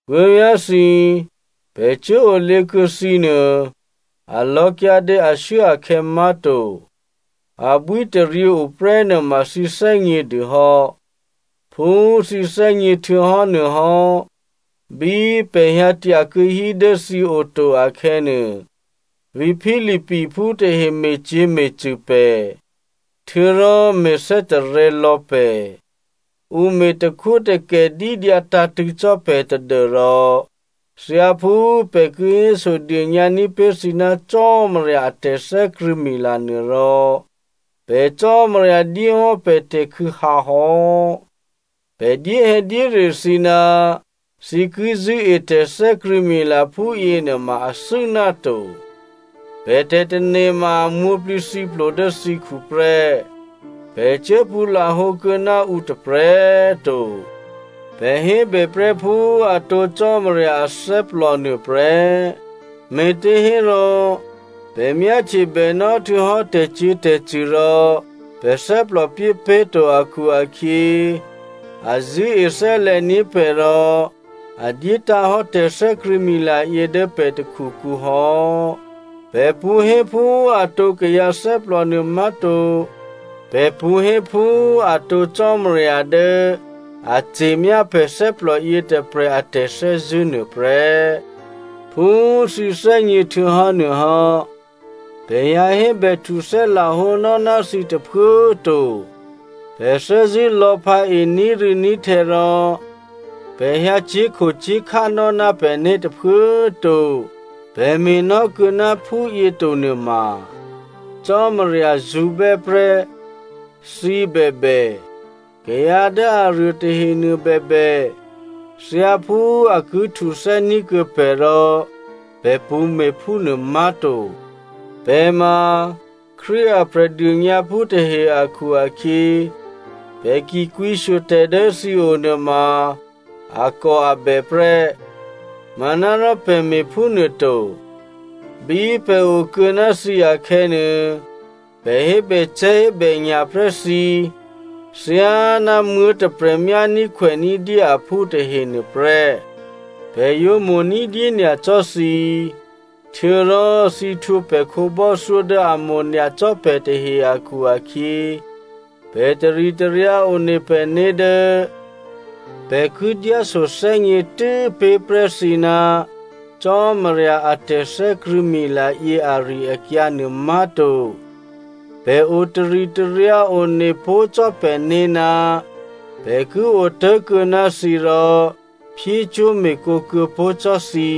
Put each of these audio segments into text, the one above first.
Puố̤vyá̤thǐ, pè̤ cuốolě kuô̌ thǐ nuô, a lò̌kyǎdě ashuốakhè̌ má̤to. Abwítaryě oprè́ nuôma thǐ thè́gně dûhò́. Phú thǐ thè́gně htuô̌hò́nuôhò́, bí pè̤ hyǎ tyakuô̌hí dố thǐ oto akhè̌nuô, vǐ̤ Philippiphú tahe me̤cyě̤me̤cṳ̂ pè̤, htuô̌rò me̤thè́tarè̤̌ lò̌ pè̤. Ǔ me̤ takhwótakè dídyǎ tǎ̤tṳ̂̌ cò́ pè̤ tadû́rò thyáphú pè̤ ki hésodônyǎ ní̤pé̤ thǐ ná Cò́marya a tè̤thè́krṳ̂̌mila nuôrò, pè̤ Cò́marya dyéhò́ pè̤ tè̤khû̌hǎ hò́. Pè̤ dyéhè̌dyére thǐ ná thǐ ki zṳ̂́e tè̤thè́krṳ̂̌mila phúyěnuôma athû́ náto. Pè̤ tè̤tane̤ ma a mwǒ̤plǐthǐplo dố thǐkhu prè́, pè̤ cuố pṳ̌ lahǒ kuô̌ ná ǔ tôprè̤꤮ to. Pè̤ hébè prè́ phú atǒ Cò́marya athè́plò nuôprè́, me̤těhérò pè̤ myáhtye bènò́ htuô̌hò́ tè̤cyě̤tè̤cṳ̂ rò pè̤ thè́plò pyépé̤ to akhu-akhyě, a zṳ̂́e thè́lè̤ní̤ pè̤ rò a dyétǎ̤hò́ tè̤thè́krṳ̂̌mila yě dố pè̤ takhukǔ hò́. Pè̤ pṳ̌ hé phú atǒ kayǎ thè́plò nuômá̤to. Pè̤ pṳ̌ hé phú atǒ Cò́marya dố a ce̤myá pè̤ thè́plòyě tôprè̤ a tè̤thè́zṳ̂́ nuôprè́. Phú thǐ thè́gně htuô̌hò́nuôhò́, pè̤ hyǎ hébèhtuthè́ lahǒnò́ ná thǐ tôphuố꤮ to. Pè̤ thè́zṳ̂́ lò̤̌phǎe ní̤rû̌ní̤htè̌ rò pè̤ hyǎ cyé̤khocyé̤khá nò́ ná pè̤né̤ tôphuố꤮ to. Pè̤ me̤nò́kuô̌ ná phúyě to nuôma Cò́marya zṳ̌bè́ prè́. Thǐ bèbè, kayǎ dố aruô tahenuô bèbè, thyáphú a ki htuthè́ ní̤kuô̌ pè̤ rò pè̤ pṳ̌me̤ phúnuô má̤to. Pè̤ ma Krístu a Prè̤dônyǎphú tahe akhu-akhyě, pè̤ ki kwǐshyo tè̤ dố thǐo nuôma akòabè prè́, manárò pè̤ me̤phúnuôto. Bí pè̤ okuô̌ ná thǐ akhè̌nuô, pè̤ hébècè̤́hébènya̤ prè́ thǐ, thyáná muố̤tôprè̤ myání̤khwèní̤ dyé aphú tahe nuôprè́. Pè̤ yǒ mo̤ ní̤dyé nyacò́ thǐ, htuô̌rò thǐ htwǒ pè̤ khǒbò́thyó dố a mo̤nyacò́ pè̤ tahe akhu-akhyě, pè̤ taritaryǎ one pè̤né̤ dố pè̤ ki dyáso thè́gně tû́pé̤prè́ thǐ ná Cò́marya a tè̤thè́krṳ̂̌mila yě ari-akyǎ nuômá̤to, pè̤ o taritaryǎ one pó̤ cò́ pè̤né̤ ná pè̤ ki otố̤kuô̌ ná thǐ rò, phyécwó̤me̤cwó̤ kuô̌pó̤ cò́ thǐ.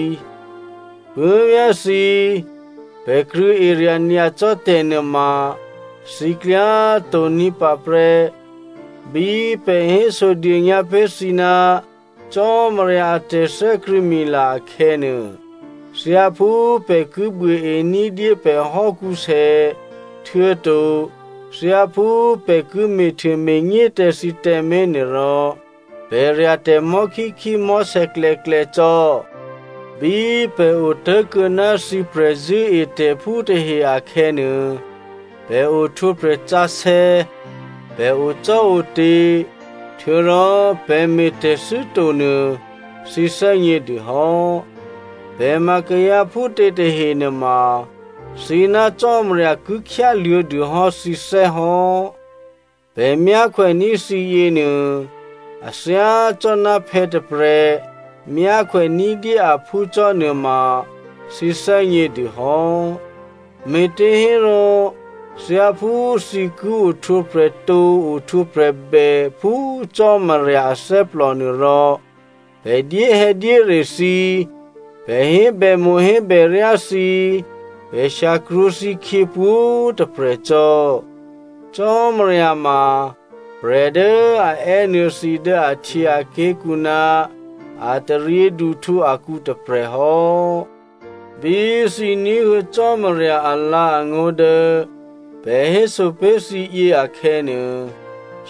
Puố̤vyá̤thǐ, pè̤ krṳ̂̌erya̤ nyacò́ tè̤ nuôma thǐ klyá tǒ̤ní̤pǎ prè́. Bí pè̤ hésodônyǎ pé̤ thǐ ná Cò́marya a tè̤thè́krṳ̂̌mila akhè̌nuô, thyáphú pè̤ ki buôe ní̤dyé pè̤ hò́kǔsè, htuô̌to thyáphú pè̤ ki me̤htuôme̤nyé tǎ thǐ tǎmé̤ nuôrò, pè̤ rya̤tè̤ mò̤́khíkhí mò̤́sè̌klè̌klè̌ cò́. Bí pè̤ otố̤kuô̌ ná thǐ prè̤zṳ̂́etè̤phú tahe akhè̌nuô, pè̤ ohtwǒprè̤ sǎsè̌, pè̤ ocò́ote̤, htuô̌rò pè̤ me̤tè̤thû́ to nuô thǐ thè́gnědûhò́. Pè̤ ma kayǎ phútě tahenuôma, thǐ ná Cò́marya ki khyáluô̌dûhò́ thǐthè́ hò́. Pè̤ myákhwèní̤ thǐ yěnuô, a thyácò́ná phè̌ tôprè̤ myákhwè ní̤dyé aphú cò́ nuôma thǐ thè́gnědûhò́. Me̤těhérò thyáphú thǐ ki ohtwǒprè̤tǒ ohtwǒprè̤bè phú Cò́marya athè́plònuô rò pè̤ dyéhè̌dyére thǐ, pè̤ hébèmo̤hébèryá thǐ, pè̤ shyakrwǒ thǐkhyě pwǒ̤꤮ tôprè̤ cò́. Cò́marya ma prè̤ dố a è́nuô̌ thǐ dố ahtyěaké̤kǔ ná a taryěduhtǔ akǔ tôprè̤hò́. Bí thǐ ní̤huô̌ Cò́marya alǎ̤angó̤ dố pè̤ héso pé̤ thǐyě akhè̌nuô,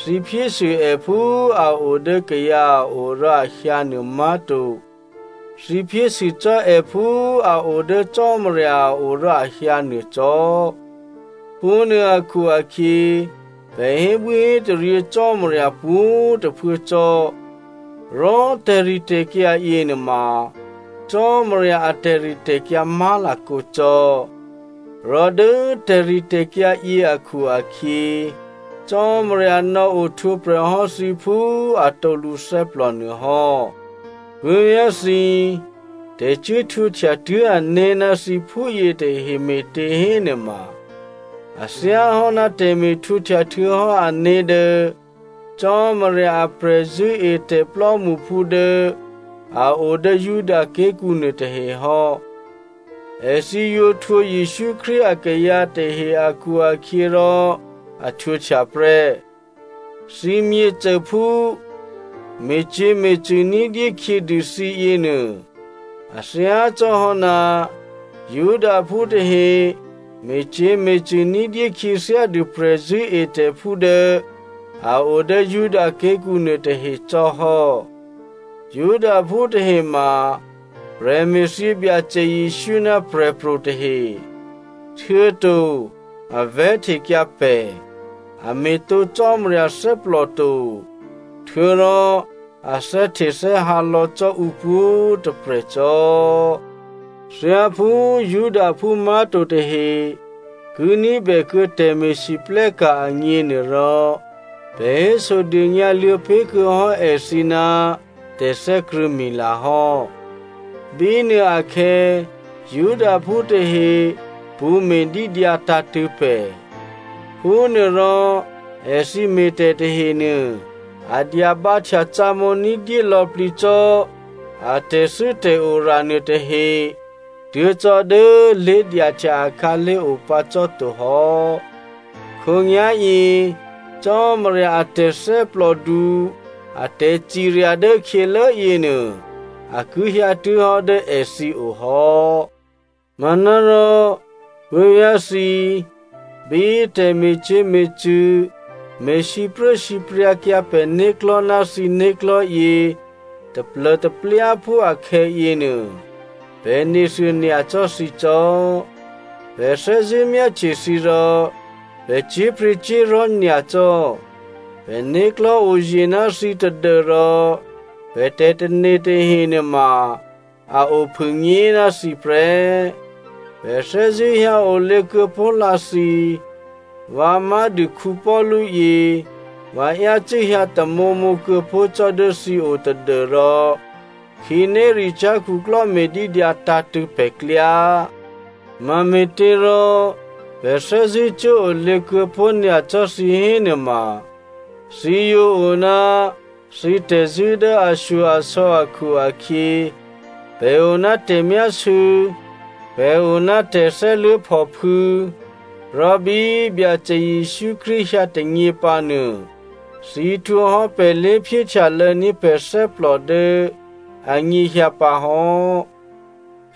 thǐ phyésû è phú a o dố kayǎ a o rò a hyǎnuô má̤to, thǐ phyésû cò́ è phú a o dố Cò́marya a o rò a hyǎ nuô cò́. Phúnuô akhu-akhyě, pè̤ hébwíhétaryě Cò́marya pwǒ̤꤮ tôphuố cò́. Rò tè̤ritè̤kyǎ yěnuôma Cò́marya a tè̤ritè̤kyǎ má̤lakǒ cò́. Rò dố tè̤ritè̤kyǎ yě akhu-akhyě, Cò́marya nò̌ohtwǒprè̤ hò́ thǐ phú atǒ lǔthè́plò nuôhò́. Puố̤vyá̤thǐ, tè̤cuốhtwǒhtya tuố̤ané̤ ná thǐ phúyětahe me̤těhénuôma a thyáhò́ ná tè̤me̤htwǒhtya htuô̌hò́ ané̤ dố Cò́marya a prè̤zṳ̂́etè̤ plò́mṳphú dố a o dố Judaké̤kǔ nuôtahe hò́. Èthǐ yǒ htwǒ Jesǔ Krístu akayǎ tahe akhu-akhyěrò a htwǒhtya prè́. Thǐ myěcôphú me̤cyě̤me̤cṳ̂ ní̤dyé khyědû thǐ yěnuô a thyácò́hò́ ná Judaphú tahe me̤cyě̤me̤cṳ̂ ní̤dyé khyěthyádû prè̤zṳ̂́etè̤phú dố a o dố Judaké̤kǔ nuôtahe cò́ hò́. Judaphú tahe ma prè̤me̤thyě Byacè Jesǔ ná prè̤pro̤ tahe, htuô̌to a vè̤́htekyǎ pè̤. A me̤tǒ Cò́marya thè́plò to, htuô̌rò, a thè́htethè́hǎ lò̌ cò́ ǔpwǒ̤꤮ tôprè̤ cò́. Thyáphú Judaphú má̤to tahe ki ní̤bè kuô̌ tè̤me̤lwóhteka̤ agněnuôrò, pè̤ hésodônyǎ luô̌ pé̤kuô̌ hò́ èthǐ ná tè̤thè́krṳ̂̌mila hò́. Bínuôakhè̌ Judaphú tahe pṳ̌ me̤dídyǎ tǎ̤tṳ̂̌ pè̤. Phúnuôrò èthǐ me̤tè̤ tahenuô, a dyabǎhtyacǒmǒ ní̤dyé lò̌plǐ cò́ a tè̤thû́tè̤ora nuôtahe tuố̤ cò́dố lé̤dyahtya akhǎlé̤ opǎ cò́to hò́. Khǒnyá̤yě Cò́marya a tè̤thè́plòdu a tè̤cirya dố khyělố yěnuô a ki hyǎtuố̤hò́ dố èthǐ o hò́. Manárò puố̤vyá̤thǐ, bí tè̤me̤cyě̤me̤cṳ̂ me̤ sipruốsipryǎkyǎ pè̤né̤klò̤́ ná thǐ né̤klò̤́yě taplô̤taplyáphú akhè̌yěnuô, pè̤ nethuô nyacò́ thǐ cò́. Pè̤ thè́zṳ̂́ myáhtye thǐ rò pè̤ cyé̤pryě̤cyé̤li̤ nyacò́. Pè̤né̤klò̤́ oye̤ ná thǐ tadû́rò pè̤ tè̤tane̤ tahe nuôma a ophûnyé ná thǐ prè́. Pè̤ thè́zṳ̂́ hyǎolě kuô̌pó̤lǎ thǐ. Vǎ má̤dû Paulu yě, vǎ yácû́ hyǎ tamǒmǒ kuô̌pó̤ cò́ dố thǐo tadû́rò khǐnéricyá̤ khuklò́ me̤dídyǎ tǎ̤tṳ̂̌ pè̤klyá. Mame̤těrò pè̤ thè́zṳ̂́ cuốolě kuô̌pó̤ nyacò́ thǐ hénuôma, thǐ yǒ o ná thǐ tè̤zṳ̂́ dố ashyo-asò̌ akhu-akhyě, pè̤ o ná tè̤myásû̌, pè̤ o ná tè̤thè́luố̤phòphû̌, rò bí Byacè Jesǔ Krístu hyǎ tônyěpǎnuô, thǐ htwǒhò́ pè̤ lé̤phyéhtyalô̌ní̤ pè̤ thè́plò dố anyěhyǎ pǎ hò́.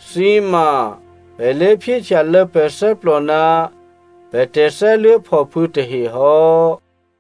Thǐ ma pè̤ lé̤phyéhtyalô̌ pè̤ thè́plò ná pè̤ tè̤thè́luố̤phòphû̌ tahe hò́.